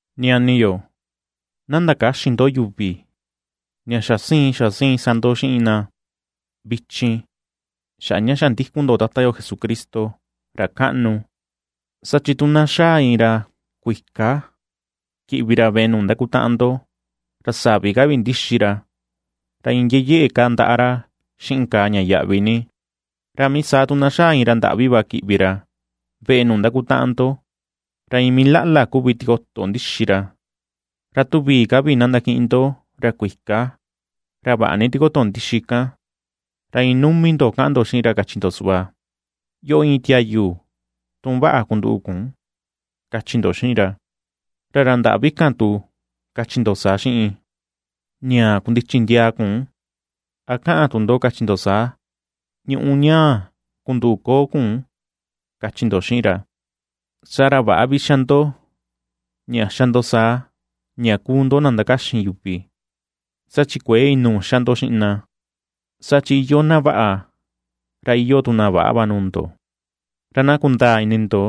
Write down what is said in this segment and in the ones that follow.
Ñani yo, na ndakäxin ndo yuvi ña xa siin, xa siin sa ndo xiꞌin na vichin, xaꞌa ña xa ndikun ndo Tata yo Jesucristo, ra kaꞌnu. Saa chi tu na xaa iin ra kuika kiꞌvi ra veꞌe nuu ndakutaꞌan ndo, ra savi ka vi ndixi ra, ra iin yeyeꞌe kaa ndaꞌa ra xiꞌin kàà ña yaꞌvi ni, ra mii saa tu na xaa iin ra ndaꞌvi va kiꞌvi ra veꞌe nuu ndakutaꞌan ndo, ra iin mii laꞌla kuvi tikoto ndixi ra; ra tu vii ka vi na ndakiꞌin ndo ra kuika, ra vaꞌa ni tikoto ndixi kan, ra iin numi ndo kaꞌan ndo xiꞌin ra kachi ndo suꞌva: “Yoꞌo íin tiayu tun vaꞌa kunduꞌu kun”, kachi ndo xiꞌin ra. Ra ra ndaꞌvi kan tu, kachi ndo saa xiꞌin: “Ñaa kundichi ndiaa kun”, a kaꞌan tu ndo kachi ndo saa: “Ñuꞌu ñaa kunduꞌu koo kun”, kachi ndo xiꞌin ra. Saa ra väꞌa vi xa ndo ña xa ndo saa ña kuu ndo na ndakaxin yuvi, saa chi kuëe inuu xa ndo xiꞌin na, saa chi iyoo na vaꞌa, ra iyoo tu na väꞌa va nuu ndo. Ra na kundaa ini ndo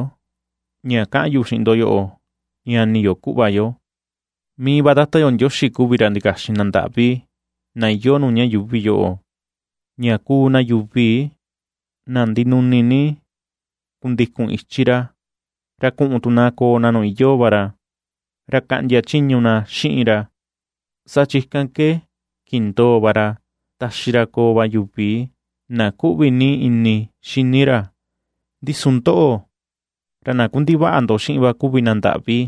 ña kaꞌan yu xiꞌin ndo yoꞌo, ñani yo, kuꞌva yo, mii va Tata yo Ndioxi kuvi ra ndikaxin na ndaꞌvi na iyoo nuu ña yuuvi yoꞌo, ña kuu na yuvi na ndinuni ni kundikun ichi ra, ra kuꞌun tu na koo na nuu iyoo va ra, ra kaꞌndia chiñu na xiꞌin ra, saa chi ikan ke kindoo ra taxi ra koo va yuvi na kuꞌvi ni ini xini ra. Ndi su ndoꞌo, ra na kundivaꞌa ndo xiꞌin va kuvi na ndaꞌvi.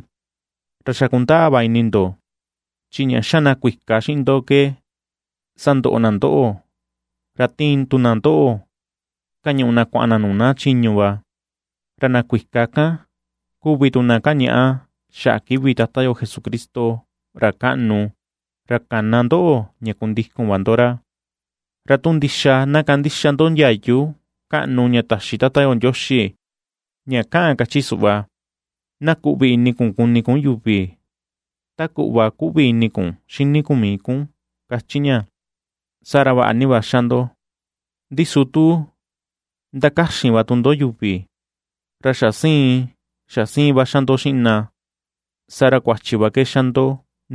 Ra xa kundaa va ini ndo, chi ña xa na kuika xiꞌin ndo ke sandoꞌo na ndoꞌo, ra tiin tu na ndoꞌo kañuꞌu na kuaꞌan na nuu na chiñu va. Ra na kuika kan kuvi tu na kañaꞌa xaꞌa kivi Tata yo Jesucristo, ra kaꞌnu, ra kana ndoꞌo ña kundikun va ndo ra. Ra tu ndixa na kandixa ndo ndiayu kaꞌnu ña taxi Tata Ndioxi, ña kaꞌan kachi suꞌva: “Na kuꞌvi ini kuni kun yuvi ta kuꞌva kuꞌvi ini kun xini kun mii kun”, kachi ña, saa ra vaꞌa ni va ^xa ndo. Ndi su tu ndakaxin va tu ndo yuvi, ra xa siin xa siin va xa ndo xiꞌin na, saa ra kuachi va ke xa ndo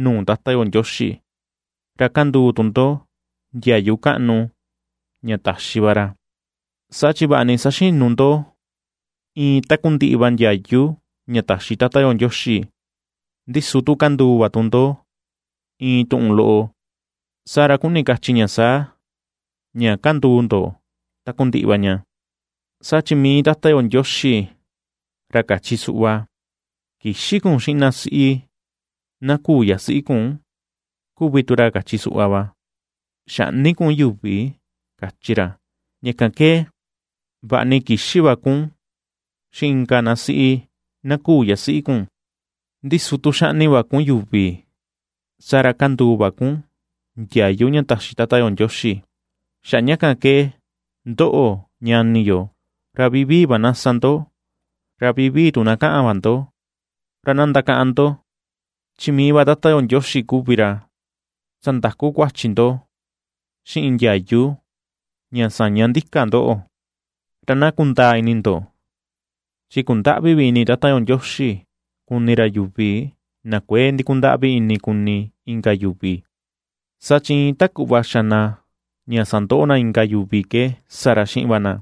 nuu Tata yo Ndioxi, ra kanduu tu ndo ndiayu kaꞌnu ña taxi va ra. Saa chi vaꞌa ni saxinu ndo iin takundiꞌi va ndiayu ña taxi Tata yo Ndioxi, ndi su tu kanduu va tu ndo iin tuꞌun loꞌo, saa ra kuni kachi ña saa, ña kanduu ndo takundiꞌi va ña. Saa chi mii Tata yo Ndioxi, ra kachi suꞌva: “Kïxin kun xiꞌin na siꞌi na küu yasiꞌi kun”, kuvi tu ra kachi suꞌva va: “Xäꞌni kun yuvi”, kachi ra. Ña kan ke, vaꞌa ni kïxin va kun xiꞌin inka na siꞌi na küu yasiꞌi kun, ndi su tu xaꞌni va kun yuvi, saa ra kanduu va kun ndiayu ña taxi Tata yo Ndioxi. Xaꞌa ña kan ke, ndoꞌo, ñani yo, ra vivii va na sa ndo, ra vivii tu na kaꞌan va ndo; ra na ndakaꞌan ndo: chi mii va Tata yo Ndioxi kuvi ra sandaku kuachi ndo xiꞌin ndiayu ña saña ndika ndoꞌo. Ra na kundaa ini ndo, chi kundäꞌvi vi ini Tata yo Ndioxi kuni ra yuvi na kuëe ndikundaꞌvi ini kuni inka yuvi, saa chi iin ta kuꞌva xa na ña sandoꞌo na inka yuvi ke sa ra xiꞌin va na;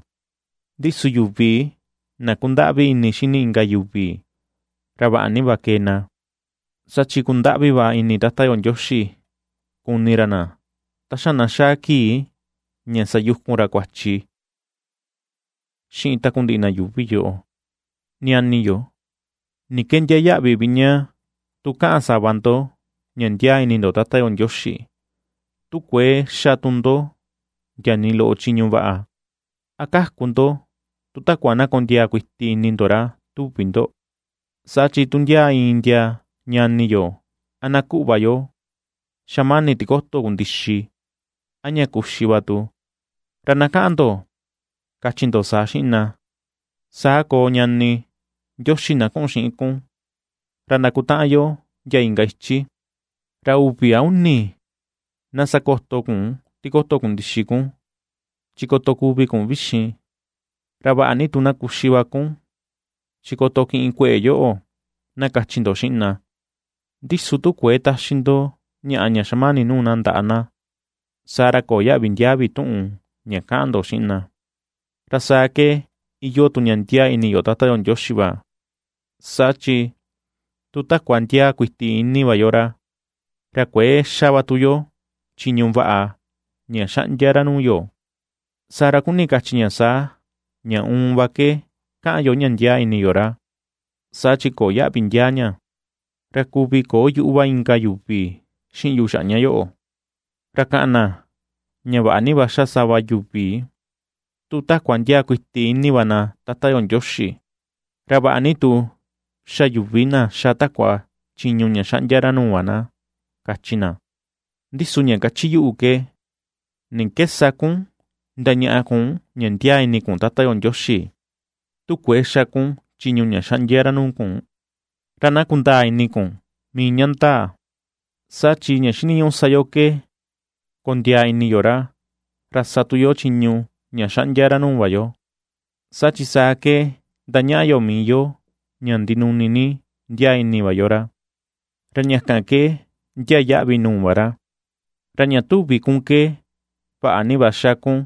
ndi su yuvi na ^kundaꞌvi ini xini inka yuvi, ra vaꞌa ni va kee na, saa chi kundaꞌvi va ini Tata yo Ndioxi kuni ra na ta xa na xaa kii ña sayukun ra kuachi xiꞌin takundiꞌi na yuuvi yoꞌo. Ñani yo, ¿ni ke ndiaa yaꞌvi vi ña tu kaꞌan sava ndo ña ndiaa ni ini ndo Tata yo Ndioxi, tu kuëe xa tu ndo ndia nii loꞌo chiñu vaꞌa? ¿A kaku ndo tu takua na kondiaa kuiti ini ndo ra, tuvi ndo? Saa chi tu ndia iin ndia ñani yo a na kuꞌva yo xamani tikoto kundixi, a ña kuxi va tu na, ra na kaꞌan ndo kachi ndo saa xiꞌin na: “Saa koo ñani, Ndioxi na kuꞌun xiꞌin kun, ra ndakutaꞌan yo ndia inka ichi, ra uvi a uni na sakoto kun tikoto kundixi kun, chi koto kuvi kun vixin, ra vaꞌa ni tu na kuxi va kun, chi koto kiꞌin kueꞌe yoꞌo”, na kachi ndo xiꞌin na; ndi su tu kuëe taxi ndo ñaꞌa ña xamani nuu na ndaꞌa na, saa ra köo yaꞌvi ndiaa vi tuꞌun ña kaꞌan ndo xiꞌin na. Ra saa ke iyoo tu ña ndiaa ini yo Tata yo Ndioxi va, saa chi tu takua ndiaa kuiti ini va yo ra, ra kuëe xa va tu yo chiñu vaꞌa ña xaꞌndia ra nuu yo, saa ra kuni kachi ña saa: ña uun va ke kaꞌan yo ña ndiaa ini yo ra, saa chi köo yaꞌvi ndiaa ña. Ra kuvi köo yuꞌu va inka yuvi xiꞌin yu xaꞌa ña yoꞌo, ra kaꞌan na ña vaꞌa ni va xa sava yuvi tu takua ndiaa kuiti ini va na Tata yo Ndioxi, ra vaꞌa ni tu xa yuvi na ^xa takua chiñu ña xaꞌndia ra nuu va na, kachi na. Ndi su ña kachi yuꞌu ke: ¿ni ke sa kun ndañaꞌa kun ña ndiaa ini kun Tata yo Ndioxi, tu kuëe xa kun chiñu ña xaꞌndia ra nuu kun? Ra na kundaa ini kun mii ña ndaa, saa chi ña xiniñuꞌu sa yo ke kondiaa ini yo ra, ra sa tu yo chiñu ña xaꞌndia ra nuu va yo, saa chi saa ke ndañaꞌa yo mii yo ña ndinuni ni ndiaa ini va yo ra, ra ña kan ke ndiaa yaꞌvi nuu va ra. Ra ña tuvi kun ke vaꞌa ni va ^xa kun,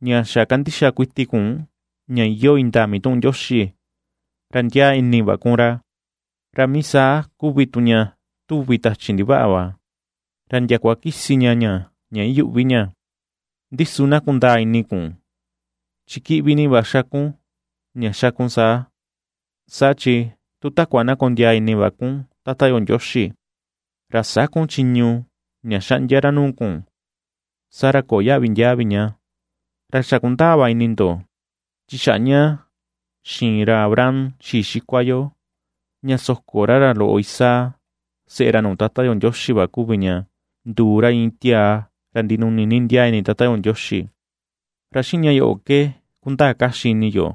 ña xa kandixa kuiti kun ña iyoo indaa mituꞌun Ndioxi, ra ndiaa ini va kun ra. Ra mii saa kuvi tu ña tuvi tachi ndivaꞌa va, ra ndiakua kisi ña ña ña iyuꞌvi ña. Ndi su na kundaa ini kun, chi kiꞌvi ni va xa kun, ña xa kun saa, saa chi tu takua na kondiaa ini va kun Tata yo Ndioxi, ra sä kun chiñu ña xaꞌndia ra nuu kun saa ra köo yaꞌvi ndiaa vi ña. Ra xa kundaa va ini ndo, chi xaꞌa ña xiin ra Abraham xii xikua yo ña soko ra ra loꞌo Isaac seꞌe ra nuu Tata yo Ndioxi va kuvi ña nduu ra iin tiaa ra ndinuni ni ndiaa ini Tata yo Ndioxi. Ra xiꞌin ña yoꞌo ke kundaa kaxi ini yo,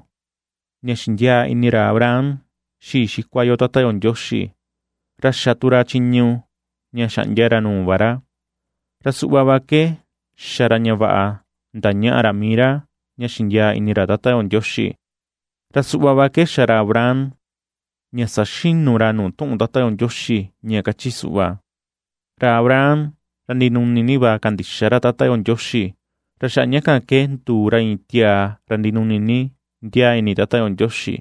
ña xindiaa ini ra Abraham xii xikua yo Tata yo Ndioxi, ra xa tu ra chiñu ña xaꞌndia ra nuu va ra, ra suꞌva va ke xa ra ña vaꞌa ndañaꞌa ra mii ra ña xindiaa ini ra Tata yo Ndioxi. Ra suꞌva ke xa ra Abraham ña saxinu ra nuu tuꞌun Tata yo Ndioxi ña kachi suꞌva: “Ra Abraham, ra ndinuni ni va kandixa ra Tata yo Ndioxi, ra xaꞌa ña kan ke nduu ra iin tiaa ra ndinuni ni ndiaa ini Tata yo Ndioxi.”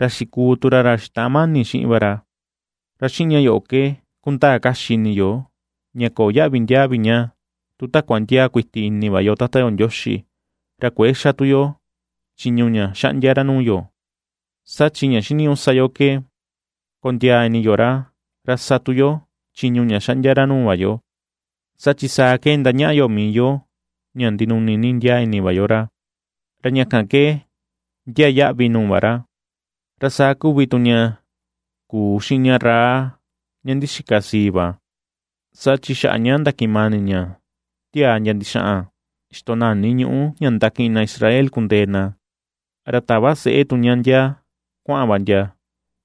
Ra xikuu tu ra ra xitaꞌan mani xiꞌin va ra. Ra xiꞌin ña yoꞌo ke kundaa kaxi ini yo, ña köo yaꞌvi ndiaa vi ña tu takua ndiaa kuiti ini va yo Tata yo Ndioxi, ra kuëe xa tu yo chiñu ña xaꞌndia ra nuu yo, saa chi ña xiniñuꞌu sa yo ke kondiaa ini yo ra, ra sa tu yo chiñu ña xaꞌndia ra nuu va yo, saa chi saa ke ndañaꞌa yo mii yo ña ndinuni ni ndiaa ini va yo ra, ra ña kan ke ndiaa yaꞌvi nuu va ra. Ra saa kuvi tu ña kuu xiꞌin ña Rahab, ña ndixika sii va; saa chi xaꞌa ña ndakiꞌin mani ña tiaa ndia ndixaꞌan xitonani ñuꞌu ña ndakiꞌin na Israel kundee na, ra tava seꞌe tu ña ndia kuaꞌan va ndia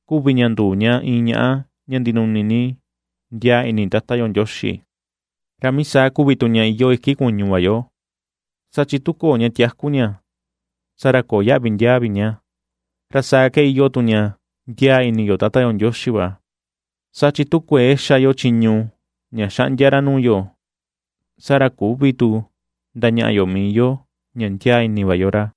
kuvi ña nduu ña iin ñaꞌa ña ndinuni ni ndiaa ini Tata yo Ndioxi. Ra mii saa kuvi tu ña iyoo iki kuñu va yo, saa chi tu köo ña tiaku ña, saa ra köo yaꞌvi ndiaa vi ña, ra saa ke iyoo tu ña ndiaa ini yo Tata yo Ndioxi va, saa chi tu kuëe xa yo chiñu ña xaꞌndia ra nuu yo, saa ra küvi tu ndañaꞌa yo mii yo ña ndiaa ini va yo ra.